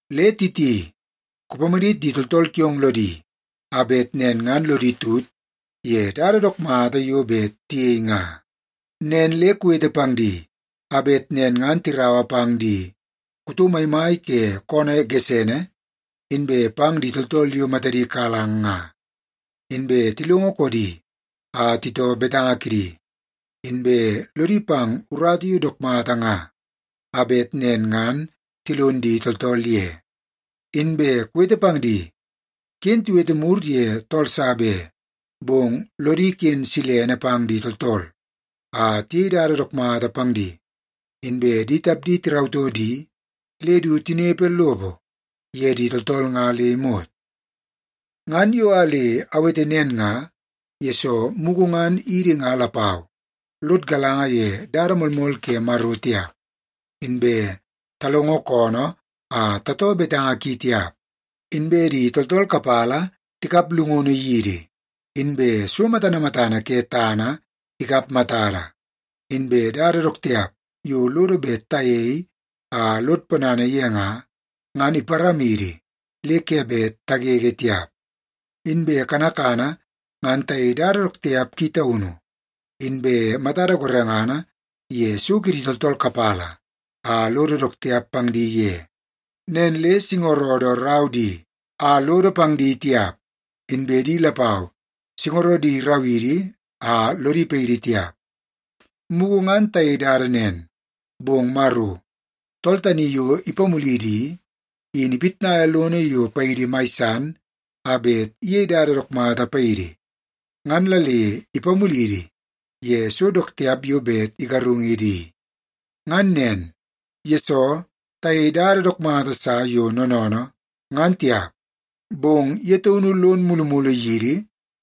Le Titi, kupamadit di tooltool kiong lodi a bet nen ngan lodi tut ye dada dook mata yo bet tiyei nga. Nen le kuwete pang di a bet nen ngan tiraua pang di kuto maimai ke koonoo gesene inbe pang di tooltool yo matadi kalang nga, inbe tilongo koodi a titoo betanga kidi, inbe lodi pang urata yo dook mata nga a bet nen ngan tilon di tooltool ye. Inbe kuwete pang di, ken tiwete mur ye tool sa be, bong lodi ken silene pang di tooltool a tiyei dada dook mata pang di, inbe di tapdi tirautoo di le du tinepe lopo ye di tooltool nga le imot. Ngan yo a le awete nen nga, yesoo mugu ngan idi nga lapau lod galanga ye dada moolmool ke Maro tiap, inbe talongo koonoo a tatoo betanga ki tiap, inbe di tooltool kapala tikap llungunu yidi, inbe so matana matana ke tana ikap matada, inbe dada dook tiap yo lodo bet tayei a lod ponana ye nga, ngan iparamidi le ke bet tagege tiap. Inbe kanakana ngan tayei dada dook tiap ki taunu, inbe matada gorengana ye so kidi tooltool kapala a lodo dook tiap pang di ye. Nen le singorodo rau di a lodo pang di tiap, inbe di lapau singorodi irau idi a lodi paidi tiap. Mugu ngan tayei dada nen, bong Maro, tool tani yo ipamulidi i, in ipitnaia lono yo paidi mai san a bet iyei dada dook mata paidi ngan la le ipamulidi ye so dook tiap yo bet igarungidi i. Ngan nen, yesoo tayeie dada dook mata sa yo noonoonoo, ngan tiap, bong ye taunu lon mulumulu yidi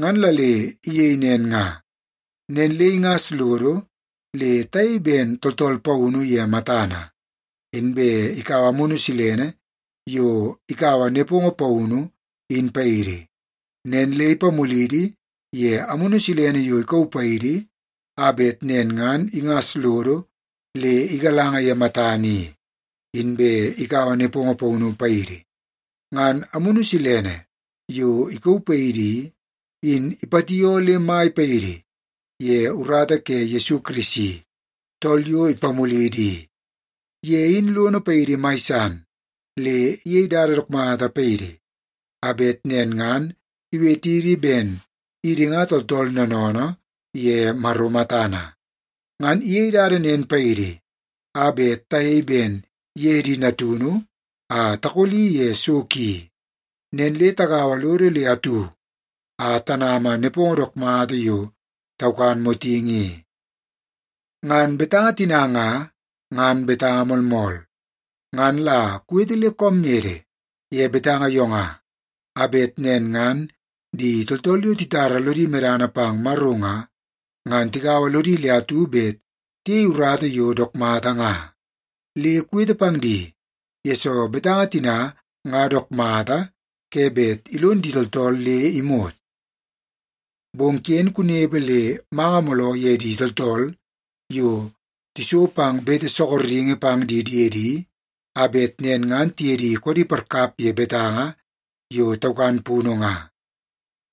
ngan la le iyei nen nga. Nen le ingas lodo le tayei ben tooltool paunu ye matana, inbe ikaua Amunu Silene yo ikaua nepongo paunu, in paidi. Nen le ipamulidi ye Amunu Silene yo ikauu paidi a bet nen ngan ingas lodo le igalanga ye matana i, inbe ikaua nepongo paunu paidi. Ngan Amunu Silene yo ikauu paidi i, in ipatioo le mai paidi ye urata ke Yesu Kirisi, tool yo ipamulidi i. Ye in lono paidi mai san le iyei dada dook mata paidi a bet nen ngan iwetidi ben idi nga tooltool noonoonoo ye Maro matana. Ngan iyei dada nen paidi a bet tayei ben ye di natunu a takoli ye so ki. Nen le tagaua lodo le atu a tanama nepongo dook mata yo taukan motingi i. Ngan betanga tina nga, ngan betanga moolmool. Ngan la kuwete le koom mede ye betanga yo nga, a bet nen ngan di tooltool yo titara lodi medana pang Maro nga, ngan tigaua lodi le atu bet tiyei urata yo dook mata nga. Le kuwete pang di, yesoo betanga tina nga dook mata ke bet ilon di tooltool le imot. Bong ken kunepe le manga mooloo ye di tooltool yo tiso pang bete sorokingi pang di diedi a bet nen ngan tiye di koodi parkap ye betanga yo taukan punu nga.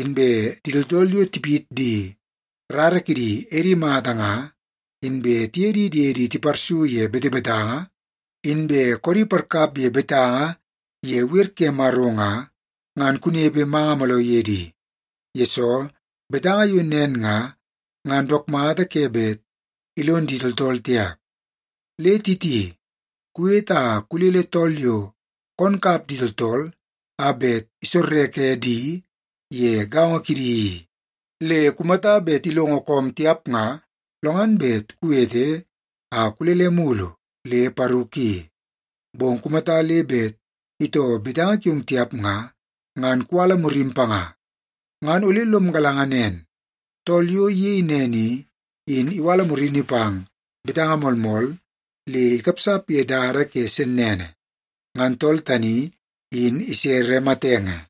Inbe di tooltool yo tipit di rara kidi edi mata nga, inbe tiye di diedi tiparsu ye betebetanga, inbe koodi parkap ye betanga ye wer ke Maro nga, ngan kunepe manga mooloo ye di, yesoo betanga yo nen nga, ngan dook mata ke bet ilon di tooltool tiap. Le Titi, kuwete a kulele tool yo koon kap di tooltool a bet isorreke di ye gaongo kidi i. Le kumata bet ilongo koom tiap nga, lo ngan bet kuwete a kulele mulu le paru ki. Bong kumata le bet itoo betanga kiong tiap nga, ngan kuwala murim panga. Ngan ole lom galanga nen tool yo iyei nen i, in iwala murini pang betanga moolmool le ikapsap ye dada ke sennene. Ngan tool tani in isere matenge.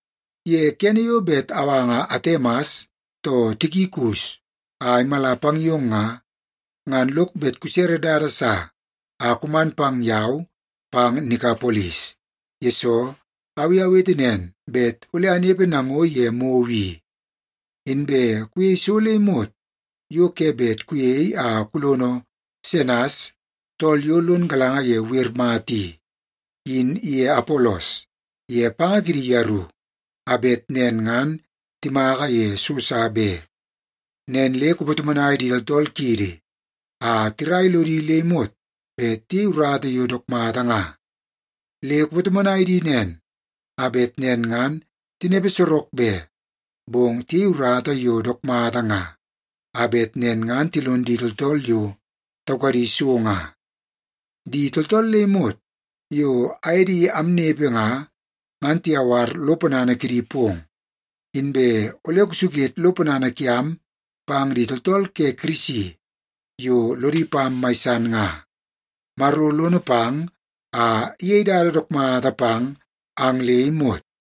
Ye kene yo bet awanga Atemas too Tikikus a imala pang yong nga, ngan lok bet kusere dada sa a kuman pang yau pang Nikapolis, yesoo au i awete nen bet ole anepe nango ye mou i. Inbe kuyei so le imot yo ke bet kuyei a kulono Senas tool yo lon galanga ye wer mata i, in iye Apolos ye panga kidi yeru a bet nen ngan timaka ye so sa be. Nen le kupatomonai di tooltool kiidi a tirai lodi le imot bet tiyei urata yo dook mata nga. Le kupatomonai di nen a bet nen ngan tinepe sorok be, bong tiyei urata yo dook mata nga a bet nen ngan tilon di tooltool yo taukadi so nga. Di tooltool le imot yo aye di amnepe nga, ngan tiyawar lo ponana kidi pong. Inbe ole kusuket lo ponana kiam pang di tooltool ke Kirisi yo lodi pam mai san nga. Maro lono pang a iyei dada dook mata pang ang le imot.